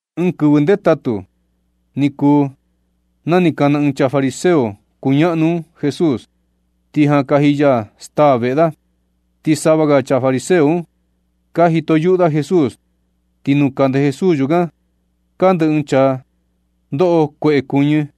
Ɨɨn kɨvɨ ndetatu ni kuu, na ni kana ɨɨn chaa fariseo kuñaꞌnu un Jesús, ni jan kaji ya staa veꞌe da, ti sava ga chaa fariseo un ka jito yuꞌu da Jesús. Ti nuu kande Jesús yukan kande ɨɨn chaa ndoꞌo kueꞌe kuɨñɨ.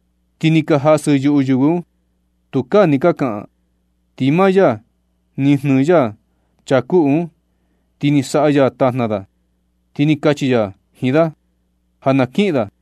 Ti ni ka jasɨ yuꞌu yɨvɨ un, tukaa ni ka kaꞌan. Ti maa ya ni jnɨɨ ya chaa kuꞌu un, ni saꞌa ya tajna da, ti ni kachi ya jiin da ja na kiꞌin da.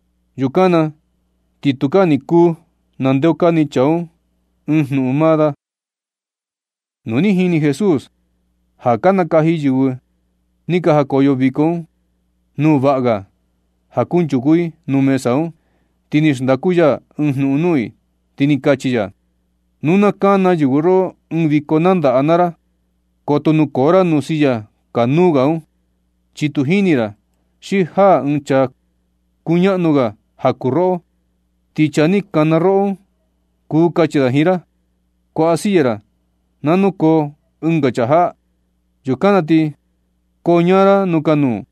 Yukan na ti tukaa ni kuu ndeokani chaa un ɨɨn jnuꞌun maa da. Nu ni jini Jesús ja ka nakaji yɨvɨ ni ka jakoyo viko un nuu vaꞌa ga ja kunchuku i nuu mesa un, ti ni xndaku ya ɨɨn jnuꞌun nuu i, ti ni kachi ya: ―Nu na kana yɨvɨ roꞌo ɨɨn viko nandaꞌa naa ra, koto nukoo ra nuu silla kanuu ga un, chi tu jini ra xi jaa ɨɨn chaa kuñaꞌnu ga ja kuu roꞌo, ti chaa ni kana roꞌo un, kuu kachi da jiin ra: “Kuaꞌa silla ra na nukoo ɨnga chaa jaꞌa.” Yukan na ti koñaa ra nuu kanuu,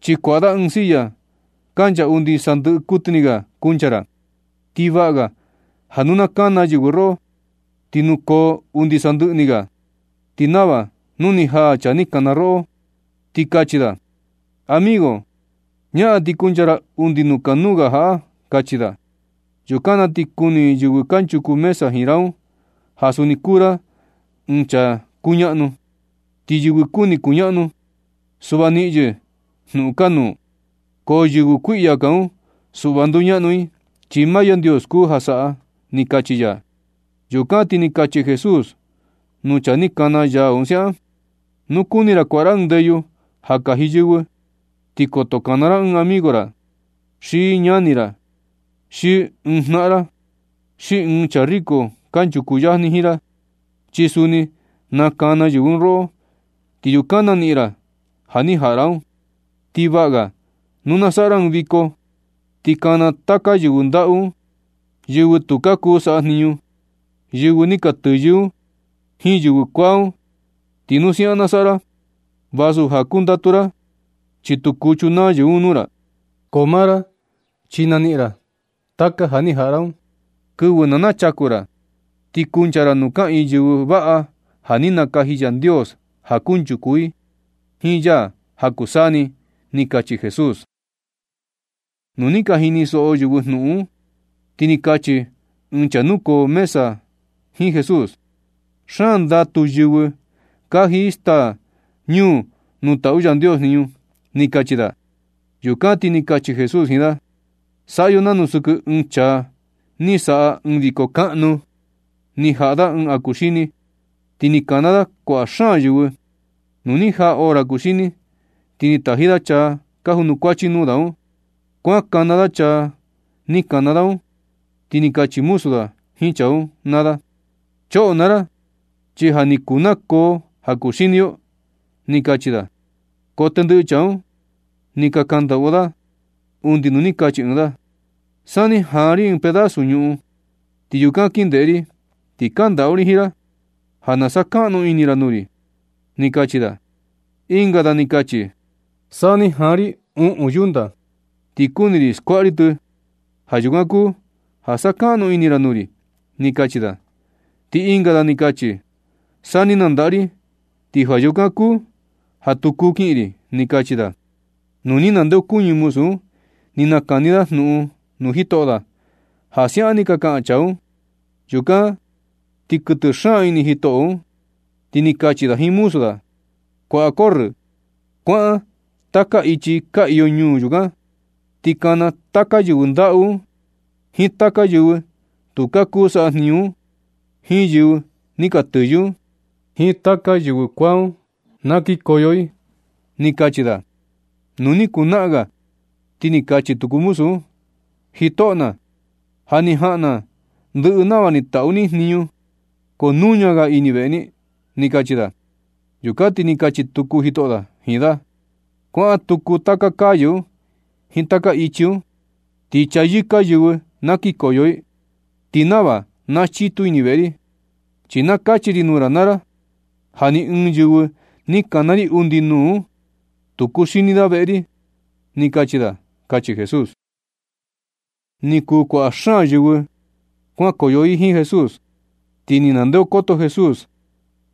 chi kuaꞌa da ɨɨn silla kancha undi sandɨꞌɨ kuɨtɨ ni ga kuncha ra. Ti vaꞌa ga ja nu na kana yɨvɨ roꞌo, ti nukoo undi sandɨꞌɨ ni ga, ti nava nu na jaa chaa ni kana roꞌo un, ti kachi da: “Amigo, ñaꞌan ti kuncha ra undi nuu kanuu ga jaꞌa”, kachi da. Yukan na ti kuni yɨvɨ kanchuku mesa jiin ra un ja suni kuu ra ɨɨn chaa kuñaꞌnu. Ti yɨvɨ kuni kuñaꞌnu, suꞌva niꞌin yɨ jnuꞌun kanuu, ko yɨvɨ kuiꞌya kaa un, suꞌva nduñaꞌnu i, chi maa Yandios kuu ja saꞌa ―ni kachi ya. Yukan ti ni kachi Jesús nuu chaa ni kana ya un siaꞌan: ―Nu kuni ra kuaꞌa ra ɨɨn ndeyu ja kaji yɨvɨ, ti koto kana ra ɨɨn amigo ra, xi ñani ra, xi ɨɨn ɨɨn jnaꞌan ra, xi ɨɨn ɨɨn chaa riko kanchuku yajni jiin ra, chi suni na kana yɨvɨ un roꞌo, ti yukan naniꞌin ra ja ni jaꞌa ra un. Ti vaꞌa ga ja nu na saꞌa ra ɨɨn viko, ti kana taka yɨvɨ ndaꞌu un, yɨvɨ tu ka kuu saꞌa jniñu, yɨvɨ ni ka tɨyɨ un jiin yɨvɨ kuaa un. Ti nu siaꞌan na saꞌa ra vasu ja kundatu ra, chi tu kuu chunaa yɨvɨ un nuu ra. Ko maa ra, chi naniꞌin ra taka ja ni jaꞌa ra un kɨvɨ na nachaku ra, ti kuncha ra nuu kaꞌiin yɨvɨ vaꞌa ja ni nakaji Yandios ja kunchuku i, i jiin ya ja kuu saa ni ―ni kachi Jesús. Nu ni ka jinisoꞌo yɨvɨ jnuꞌun un, ti ni kachi ɨɨn chaa nukoo mesa un jiin Jesús: ―Xaan ndatu yɨvɨ kaji i staa ñuu nuu taꞌu Yandios jniñu ―ni kachi da. Yukan ti ni kachi Jesús jiin da: ―Saꞌa yo nanu sɨkɨ ɨɨn chaa ni saꞌa ɨɨn viko kaꞌnu, ni jaꞌa da ɨɨn ja ni kuxini, ti ni kana da kuaꞌa xaan yɨvɨ. Nu ni jaa hora kuxini, ti ni taji da chaa ka junukuachi nuu da un, kuan kana da chaa ni kana da un, ti ni kachi muzu da jiin chaa un naa da: “Choꞌo naa ra, chi ja ni kuu nakoo ja kuxini yo”, ni kachi da. Ko tendɨꞌɨ chaa un ni ka kandaꞌu. Undi nuu ni kachi ɨɨn da: “San ni jaan ri ɨɨn pedazu ñuꞌun, ti yukan kin ndeꞌe ri, ti kandaꞌu ri jiin ra ja na sakaꞌnu ini ra nuu ri”, ni kachi da. Ɨnga da ni kachi: “San ni jaa ri uꞌun yunta, ti kuni ri skuaꞌa ri tɨ. Ja yukan kuu ja sakaꞌnu ini ra nuu ri”, ni kachi da. Ti ɨnga da ni kachi: “San ni nandaꞌa ri, ti ja yukan kuu ja tu kuu kiꞌin ri”, ni kachi da. Nu ni nandeokuñɨ muzu un, ni nakani da jnuꞌun nuu jitoꞌo da ja siaꞌan ni ka kaꞌan chaa un. Yukan ti ni kuɨtɨ xaan ini jitoꞌo un, ti ni kachi da jiin muzu da un: “Kuaꞌa corrɨ. Kuaꞌan taka ichi ka iyo ñuu yukan, ti kana taka yɨvɨ ndaꞌu un, jiin taka yɨvɨ tu ka kuu saꞌa jniñu un, jiin yɨvɨ ni ka tɨyɨ un, jiin taka yɨvɨ kuaa un na kikoyo i”, ni kachi da. Nu ni kuu naꞌan ga, ti ni kachi tuku muzu un: “Jitoꞌo na, ja ni jaꞌan ndɨꞌɨ na nava ni taꞌu ni jniñu, ko nuña ga ini veꞌe ni”, ni kachi da. Yukan ti ni kachi tuku jitoꞌo da jiin da: “Kuaꞌan tuku taka calle un jiin taka ichi un, ti chayɨka yɨvɨ na kikoyo i, ti nava na chitu ini veꞌe ri. Chi na kachi ri nuu ra naa ra, ja ni ɨɨn yɨvɨ ni kana ri undi nuu un, tu kuxini da veꞌe ri”, ni kachi da ―kachi Jesús. Ni kuu kuaꞌa xaan yɨvɨ kuankoyo i jiin Jesús, ti ni ndeokoto Jesús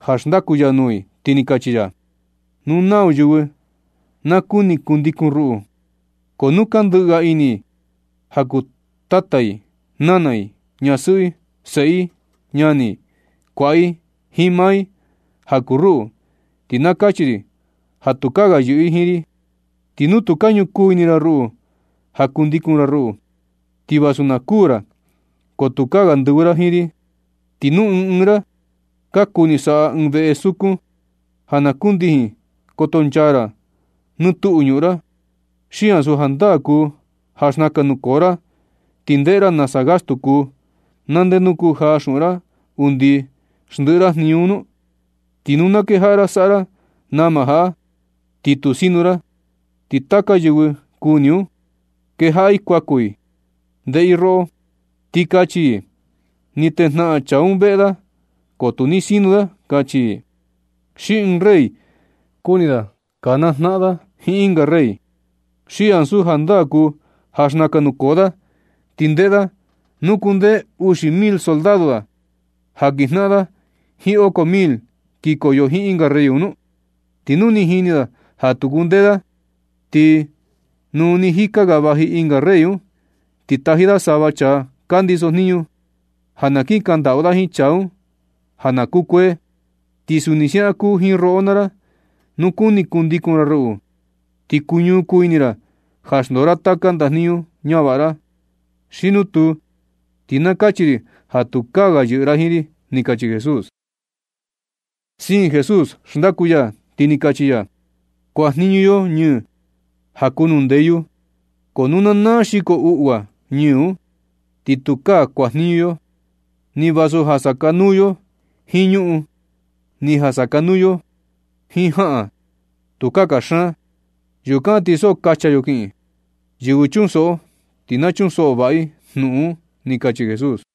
ja xndaku ya nuu i, ti ni kachi ya: ―Nu nau yɨvɨ na kuni kundikun ruꞌu, ko nu ka ndɨꞌɨ ga ini i ja kuu tata i, nana i, ñasɨꞌɨ i, seꞌe i, ñani i, kuaꞌa i, jiin maa i, ja kuu ruꞌu, ti na kachi ri ja tukaa ga yɨꞌɨ i jiin ri. Ti nu tu ka ñukuu ini ra ruꞌu ja kundikun ra ruꞌu, ti vasu na kuū ra, ko tukaa ga ndɨvɨ ra jiin ri. Ti nu ɨɨn ɨɨn ra ka kuni saꞌa ɨɨn veꞌe sukun ja na kundijin kotonchaa ra nɨ tuꞌu ñuꞌun ra, ¿xi ansu jandaa kuu ja xnakan nukoo ra, ti ndeꞌe ra nasa gastu kuu, na ndenu kujaa xuꞌun ra undi xndiꞌi ra jniñu un nu? Ti nu na kejaꞌa ra saꞌa ra nama jaꞌa, ti tu sinu ra, ti taka yɨvɨ kuni un, kejaꞌa i kuaku i ndeꞌe i roꞌo, ti kachi i: “Ni tejnaꞌan chaa un veꞌe da ko tu ni sinu da”, kachi i. Xi ɨɨn rey kuni da kanaa jnaꞌan da jiin ɨnga rey, ¿xi ansu jandaa kuu ja xnakan nukoo da, ti ndeꞌe da nu kundee uxi mil soldado da ja kinjnaꞌan da jiin oko mil kikoyo jiin ɨnga rey un nu? Ti nu ni jini da ja tu kundee da, ti nu nɨ jika vaji ɨnga rey un, ti taji da sava chaa ka ndiso jniñu, ja na kin kaꞌan ndaꞌu jiin chaa un ja na kukuee. Ti suni siaꞌan kuu jiin roꞌo naa ra, nu kuni kundikun ra ruꞌu, ti kuñu kuu ini ra ja xndoo ra taka ndajniñu ñavaꞌa ra. Xi nu tuu, ti na kachi ri ja tukaa ga yɨꞌɨ ra jiin ri ―ni kachi Jesús. Siin Jesús xndaku ya, ti ni kachi ya: ―Kuanjniñu yo ñɨɨ ja kuu nuu ndeyu, ko nu na naa xiko uꞌua ñɨɨ un, ti tukaa kuajniñu yo, ni vasu ja sakanuu yo jiin ñuꞌun, ni ja sakanuu yo jiin jaꞌan. Tukaa kaxaan. Yukan ti so kacha yo kiꞌin. Yɨvɨ chunsoꞌo, ti na chunsoꞌo vaꞌa i jnuꞌun un ―ni kachi Jesús.